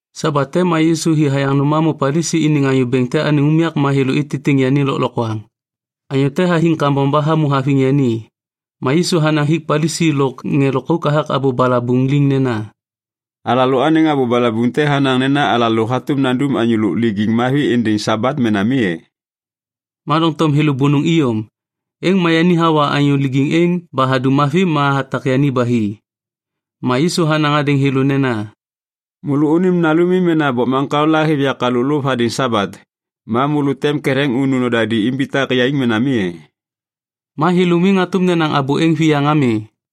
Sabat te ma Yisu hi hayaŋ nôm hamô Palisi iniŋ anyô bêŋ te anêŋ unyak ma thêlô ititiŋ yani lôklokwaŋ. Anyô te hathiŋ kambom ba hamô haviŋ yani. Ma Yisu hanaŋ hik ŋê Palisi lôk ŋê lôkauk hathak abô balabuŋ liŋ nena, “Alalôaniŋ abô balabuŋ te hanaŋ nena alalô hatôm nandum anyô lôk lijiŋ mavi êndêŋ Sabat mena mi e?” Ma doŋtom thêlô bônôŋ iyom. Êŋ ma yani hawa anyô lijiŋ êŋ ba hadum yani mavi ma hatak yani ba hi. Ma Yisu hanaŋ hadêŋ thêlô nena, “Môlônim nalumi mena bokmaŋkao la hêv yak halôk lôv hadêŋ Sabat, ma môlô tem ketheŋ unu nodadi imbitak yaiŋ mena mi e?” Ma thêlô miŋ hatôm nenaŋ abô êŋ viyaŋ ami.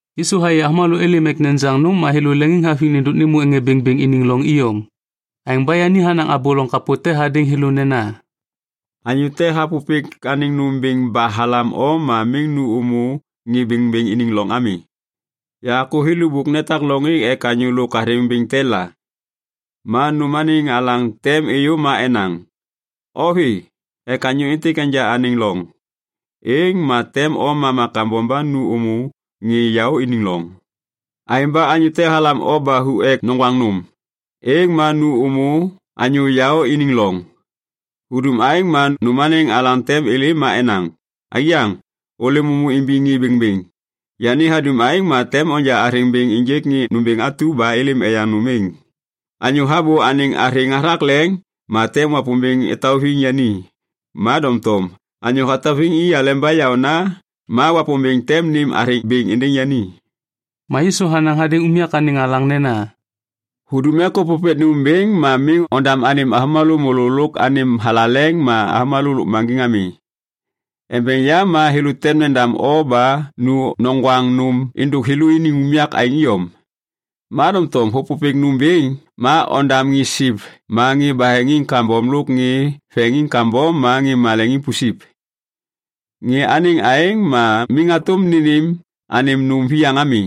Yisu hayê avômalô êlêm ek nejaŋ nôm ma thêlô leŋiŋhaviŋ nêndôk nêmô ŋê bêŋbêŋ iniŋ loŋ iyom. Aêŋ ba yani hanaŋ abô loŋ kapô te hadêŋ thêlô nena, “Anyô te hapôpêk anêŋ nôm bêŋ ba halam o ma miŋ nu ômô ŋê bêŋbêŋ iniŋ loŋ ami. Yakô thêlô bôk netak loŋ êŋ ek anyô lôk athêŋ bêŋ te la. Ma nôm anêŋ alaŋ tem êyô ma enaŋ, ‘O vê ek anyô êntêk enja anêm loŋ.’ Êŋ ma tem o mama kambom ba nu ômô ŋê yaô iniŋ loŋ. Aêŋ ba anyô te halam o ba hu ek noŋgwaŋ nôm, êŋ ma nu ômô anyô yaô iniŋ loŋ. Hudum aêŋ ma nôm anêŋ alaŋ tem êlêm ma enaŋ, ‘Aiyaŋ, ôlêm ômô imbiŋ ŋê bêŋbêŋ.’ Yani hadum aêŋ ma tem onja athêŋ bêŋ ênjêk ŋê nômbêŋ atu ba êlêm eyaŋ nôm êŋ. Anyô habô anêŋ athêŋ hathak leŋ ma tem Wapômbêŋ etauviŋ yani. Ma doŋtom anyô hatauviŋ i aleba yaôna ma Wapômbêŋ tem nêm athêŋ bêŋ êndêŋ yani.” Ma Yisu hanaŋ hadêŋ unyak anêŋ alaŋ nena, “Hudum ek ôpôpêk nôm bêŋ ma miŋ ondam anêm avômalô môlô lôk anêm thalaleŋ ma avômalô lôkmaŋgiŋ ami. Embeŋ yam ma thêlô tem nendam o ba nu noŋgwaŋ nôm êndôk thêlôniŋ unyak aêŋ iyom. Ma doŋtom hôpôpêk nôm bêŋ, ma ondam ŋê siv ma ŋê baheŋiŋ kambom lôk ŋê veŋiŋ kambom ma ŋê maleŋiŋ pusip. Ŋê anêŋ aêŋ ma miŋ hatôm nênêm anêm nôm viyaŋ ami.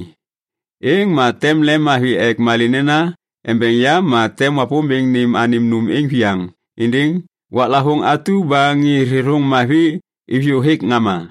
Êŋ ma tem lemmavi ek malê nena embeŋ yam ma tem Wapômbêŋ nêm anêm nôm êŋ viyaŋ êndêŋ waklavôŋ atu ba ŋê thêthôŋ mavi iviyô hêk ŋama.”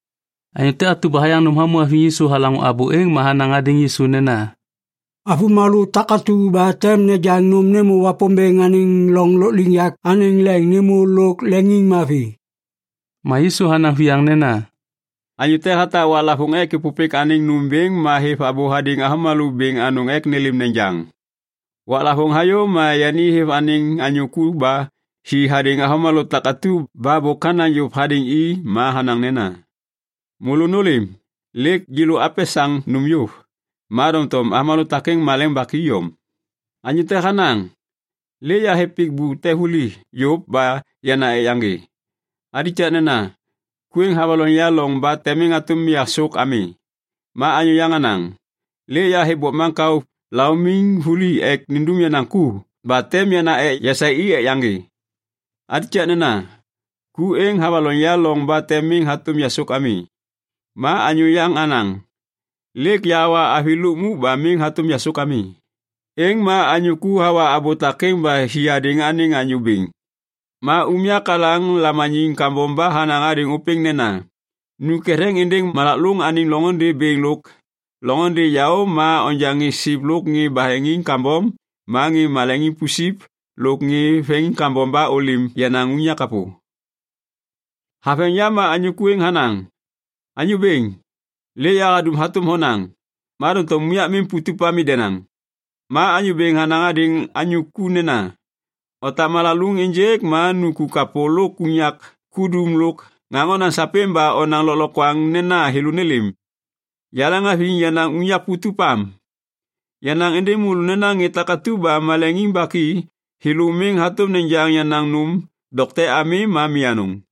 Anyô te atu ba hayaŋ nôm hamô haviŋ Yisu halaŋô abô êŋ ma hanaŋ hadêŋ Yisu nena, “Avômalô takatu ba tem nejaŋ nôm nêmô Wapômbêŋ anêŋ loŋ lôkliŋyak anêŋ leŋ nêmô lôk leŋiŋmavi.” Ma Yisu hanaŋ viyaŋ nena, “Anyô te hatak waklavôŋ te ek êpôpêk anêŋ nôm bêŋ ma hêv abô hadêŋ avômalô bêŋ anôŋ ek nêlêm nejaŋ. Waklavôŋ hayô ma yani hêv anêŋ anyô ku ba hi hadêŋ avômalô takatu ba bôk hanaŋ yôv hadêŋ i ma hanaŋ nena, ‘Môlô nôlêm, lêk yêlô apesaŋ nôm yôv.’ “Ma doŋtom avômalô takêŋ maleŋ baki iyom. Anyô te hanaŋ, ‘Lêk yahêv pik te vuli yôv ba yana ek yaŋgê. Alikakna, ku êŋ havaloŋ ya loŋ ba tem miŋ hatôm yasôk ami.’ “Ma anyô yaŋ hanaŋ, ‘Lêk yahêv bokmaŋkao laumiŋ vuli ek nindum yenaŋ ku ba tem yana ek yasaê i ek yaŋgê. Alikakna, ku êŋ havaloŋ ya loŋ ba tem miŋ hatôm yasôk ami.’ “Ma anyô yaŋ hanaŋ, ‘Lêk yahawa avi lukmuk ba miŋ hatôm yasôk ami.’ “Êŋ ma anyô ku hawa abô takêŋ ba hi hadêŋ anêŋ anyô bêŋ. Ma unyak anêŋ alaŋ lamaniŋ kambom ba hanaŋ hadêŋ ôpêŋ nena, ‘Nu ketheŋ êndêŋ malak lôŋ anêŋ loŋôndê bêŋ lôk loŋôndê yaô ma onja ŋê siv lôk ŋê baheŋiŋ kambom ma ŋê maleŋiŋ pusip lôk ŋê veŋiŋ kambom ba ôlêm yenaŋ unyak kapô.’ “Haveŋ yam ma anyô ku êŋ hanaŋ, ‘Anyô bêŋ, lêk yahadum hatôm honaŋ, ma doŋtom unyak miŋ putup ami denaŋ.’ “Ma anyô bêŋ hanaŋ hadêŋ anyô ku nena, ‘Otak malak lôŋ ênjêk ma nu ku kapô lôk unyak kudum lôk ŋaŋ onaŋ sapêŋ ba onaŋ lôklokwaŋ nena thêlô nêlêm. Yaleŋhaviŋ yenaŋ unyak putup am. Yanaŋ êndêŋ môlô nena ŋê takatu ba maleŋiŋ baki, thêlô miŋ hatôm nejaŋ yenaŋ nôm dokte ami ma mi anôŋ.’”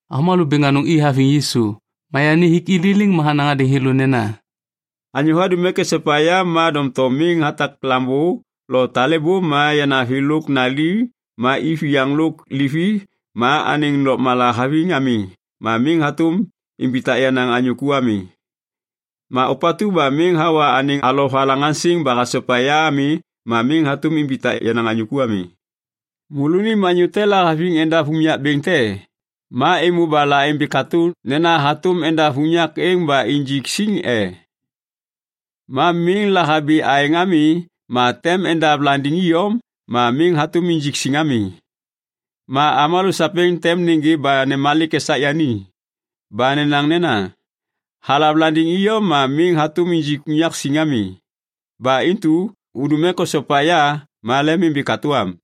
Avômalô bêŋ anôŋ i haviŋ Yisu. Ma yani hik i liliŋ ma hanaŋ hadêŋ thêlô nena, “Anyô hadum ek esopa ya ma doŋtom miŋ hatak lambô lo talêbô ma yanavi lôk nali ma iviyaŋ lôk livi ma anêŋ lôkmala haviŋ ami ma miŋ hatôm imbitak yenaŋ anyô ku ami. Ma ôpatu ba miŋ hawa anêŋ alovalaŋaŋsiŋ ba hasopa ya ami ma miŋ hatôm imbitak yenaŋ anyô ku ami. “Môlônim anyô te lahaviŋ endav unyak bêŋ te, ma êmô ba laimbi katô nena hatôm endav unyak êŋ ba injik siŋ e. Ma miŋ lahabi aêŋ ami ma tem endav landiŋ iyom ma miŋ hatôm injik siŋ ami. Ma avômalô sapêŋ tem nêgê ba nemalik esak yani ba nenaŋ nena, ‘Halav landiŋ iyom ma miŋ hatôm injik unyak siŋ ami!’ Ba intu hudum ek osopa ya ma lemimbi katô am.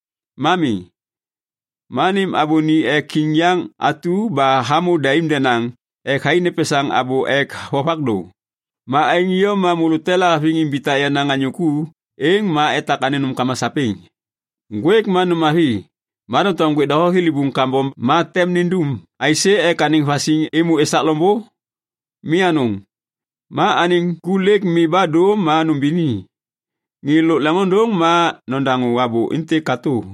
Ma mi, ma nêm abô ni ek kiŋ yaŋ atu ba hamô daim denaŋ ek thai nepesaŋ abô ek vovak dô. “Ma aêŋ iyom ma môlô te lahaviŋ imbitak yenaŋ anyô ku, êŋ ma etak anêŋ nômkama sapêŋ. “Ŋgwêk ma nôm mavi. Ma doŋtom ŋgwêk doho thilibuŋ kambom ma tem nindum aisê ek anêŋ vasiŋ êmô esak loŋbô? Mi anôŋ. Ma anêŋ ku lêk mi ba dô ma nubini. Ŋê lôk leŋôndôŋ ma nodaŋô abô êntêk katô.”